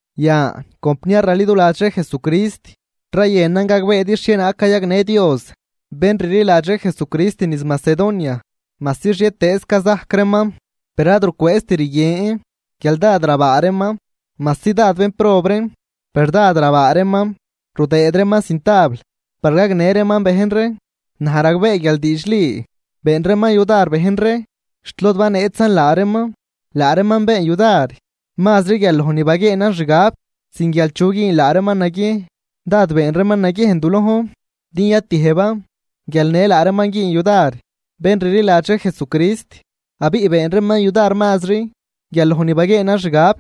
Yan compniar raliduladx ree Jesucrist, rayënan gagbeedi xhienaag cayagnë Dios bén rliladx ree Jesucrist niz Macedonia. Majsi xhietëëz cazajc reeman, per ad rucwëëzt rguien guial dád rabaa reeman. Majsi dád bénprob reen, per dad rabaa reeman rudëëd reeman cintabl par gagnë reeman bejn ree. Naj ragbee guial diidxli been reeman yudar bejn ree xt lod baneetzan laa reeman. Laa reeman been yudar mazri guial loj ni baguieenan xgab, sin guial chu güün laa reeman naguiejn. Dád been reeman naguiejn du lojn din yatiëjban guial në laa reeman güün yudar bén rliladx ree Jesucrist, abiꞌ been reeman yudar mazri guial loj ni baguieenan xgab,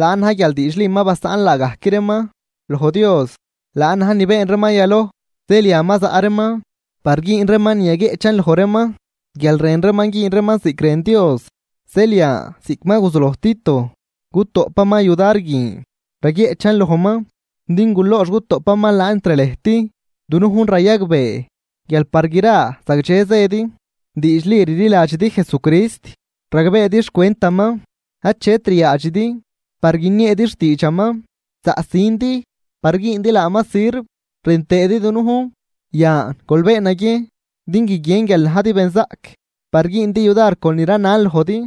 laan na̱j guial diidxli ma basaꞌn laagajc reeman loj Dios, laan na̱j ni been reeman yaloj. Zeel yan ma zaꞌ reeman par güün reeman ni yaguieꞌchan loj reeman guial rën reeman güün reeman ziꞌc rën Dios. Zeel yan ziꞌc ma guzuloj Tito cutoꞌpaman yudar guin, raguieꞌchan lojman din gulox gutoꞌpaman laan entr lëjt. Dunujn rayagbee guial par gra zagdxe zëdi: Diidxli rliladxidi Jesucrist, ragbeedi xcwentaman, achet ryaadxidi par guinieedi xtiidxaman, zaꞌsindi par güündi laaman sirv rën tëëdi dunujn, yan gol been naguiejn din guiguien guial najdi benzaꞌc par güündi yudar con ni ranan lojdi.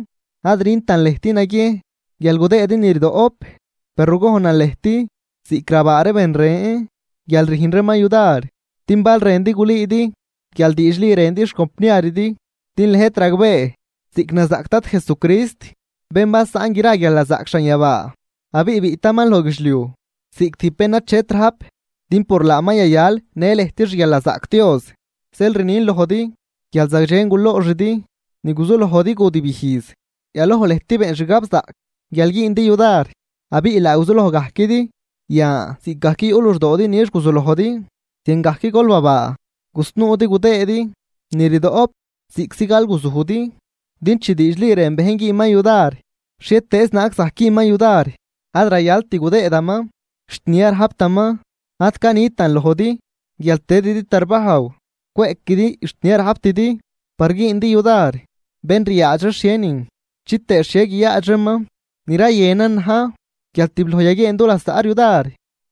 Ad rüntan lëjt naguiejn guial gudëëdi ni rdoꞌp, per rugojnan lëjt ziꞌc rabaa ree ben ren guial rüjn reeman yudar, din bal rëndi gulüüdi guial diidxli rëndi xcompniaridi. Din lëjt ragbee ziꞌc nazaꞌc Dad Jesucrist, bén basaꞌn gra guialnazaꞌc xanyabaa, abiꞌ biꞌtaman loj guidxliuj ziꞌc tijb bén ni achet rajp din por laaman yayal në lëjt xguialnazaꞌc Dios. Zeel rnin lojdi guial zagdxen gulooxidi ni guzulojdi gudibijz. Yaloj lëjt been xgabzaꞌc guial güündi yudar, abiꞌ laa guzuloj gajquidi. Yan ziꞌcgajc yuꞌ luxdoodi nix guzulojdi, ziangajc gol babaa gusnuudi gudëëdi ni rdoꞌp ziꞌctzi galguzujdi. Din chi diidxli rën bejn güünman yudar, xhietëëz naag zajc güünman yudar. Ad rayalt gudëëdaman xt ni ad rajptaman. Ad canitan lojdi guial tëdidi tarbajw cweꞌquidi xt ni ad rajptidi par güündi yudar bén ryaadx ree xhienin chitëë xhie guiyaadx reeman, ni rayënan na̱j guial tibloj yaguieen dulasaꞌ ree yudar.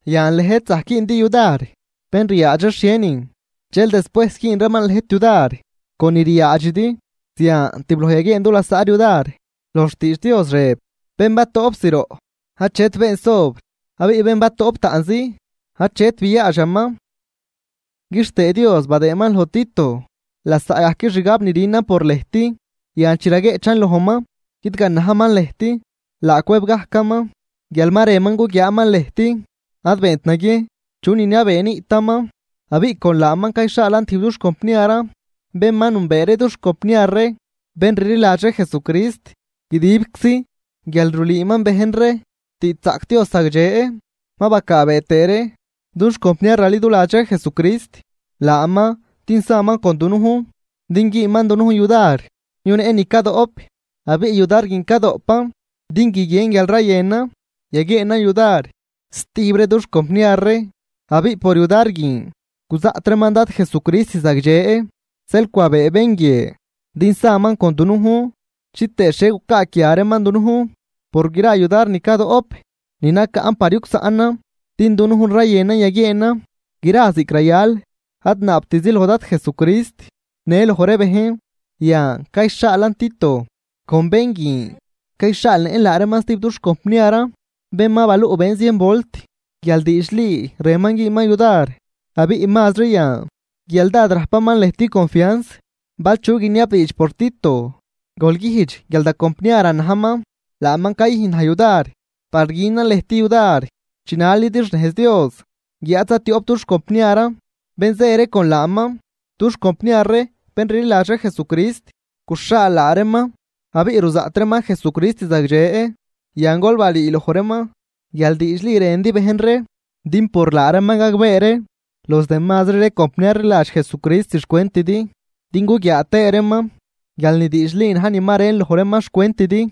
Yan lëjt zajc güündi yudar bén ryaadx ree xhienin, dxel despuejs güün reeman lëjt yudar con ni ryaadxidi. Zian tibloj yaguieen du lasaꞌ ree yudar. Loj xtiidx Dios rëb: “Bén batoꞌp zroꞌ achet been sobr, abiꞌ bén batoꞌp taꞌnzi achet biaadxaman.” Quixtëë Dios badëëman loj Tito lasaꞌgajc xgab rünan por lëjt. Yan chi raguieꞌchan lojman guidganajman lëjt, laa cwëb gajcaman guial ma rënman guguiaaman lëjt, ad beent naguiejn chu niniabee niꞌtaman. Abiꞌ con laaman cayxhaalan stijb dux compniaran bén ma nünbee ree dux compniar ree bén rliladx ree Jesucrist guidibczi, guial rulüüman bejn ree xtiidxzaꞌc Dios zagdxe. Ma bacaabee tëë ree dux compniar raliduladx ree Jesucrist laaman din saman con dunujn din güünman dunujn yudar yuneꞌn ni cadoꞌp. Abiꞌ yudar guin cadoꞌpan din guiguien guial rayënan yaguieenan yudar stijb ree dux compniar ree, abiꞌ por yudar guin guzaꞌt reeman Dad Jesucrist zagdxe. Zeel cwabee bén guie din saman con dunujn chitëë xhie gucaaquia reeman dunujn por gra yudar ni cadoꞌp ni nacaꞌn par yugsaꞌnan. Din dunujn rayënan yaguieenan gra ziꞌc rayal, ad naabtizi loj Dad Jesucrist, në loj ree bejn. Yan cayxhaalan Tito con bén guin cayxhaalnëꞌn laa reeman stijb dux compniaran bén ma baluꞌbeen zien volt guial diidxli rënman güünman yudar, abiꞌ mazri yan guial dád rajpaman lëjt confians. Bal chu guiniabdiidx por Tito, gol güjdx guial da compniaran najman, laaman cayüjn naj yudar par günan lëjt yudar chinalidi xnejz Dios. Guiáad zaꞌ tioꞌp dux compniaran bén zë ree con laaman, dux compniar ree bén rliladx ree Jesucrist guxhaal laa reeman, abiꞌ ruzaꞌt reeman Jesucrist zagdxe. Yan gol balüü loj reeman guial diidxli rëndi bejn ree, din por laa reeman gagbee ree los demazri ree compniar rliladx Jesucrist xcwentidi, din guguiaa tëë reeman guial ni diidxli na̱j ni ma rën loj reeman xcwentidi.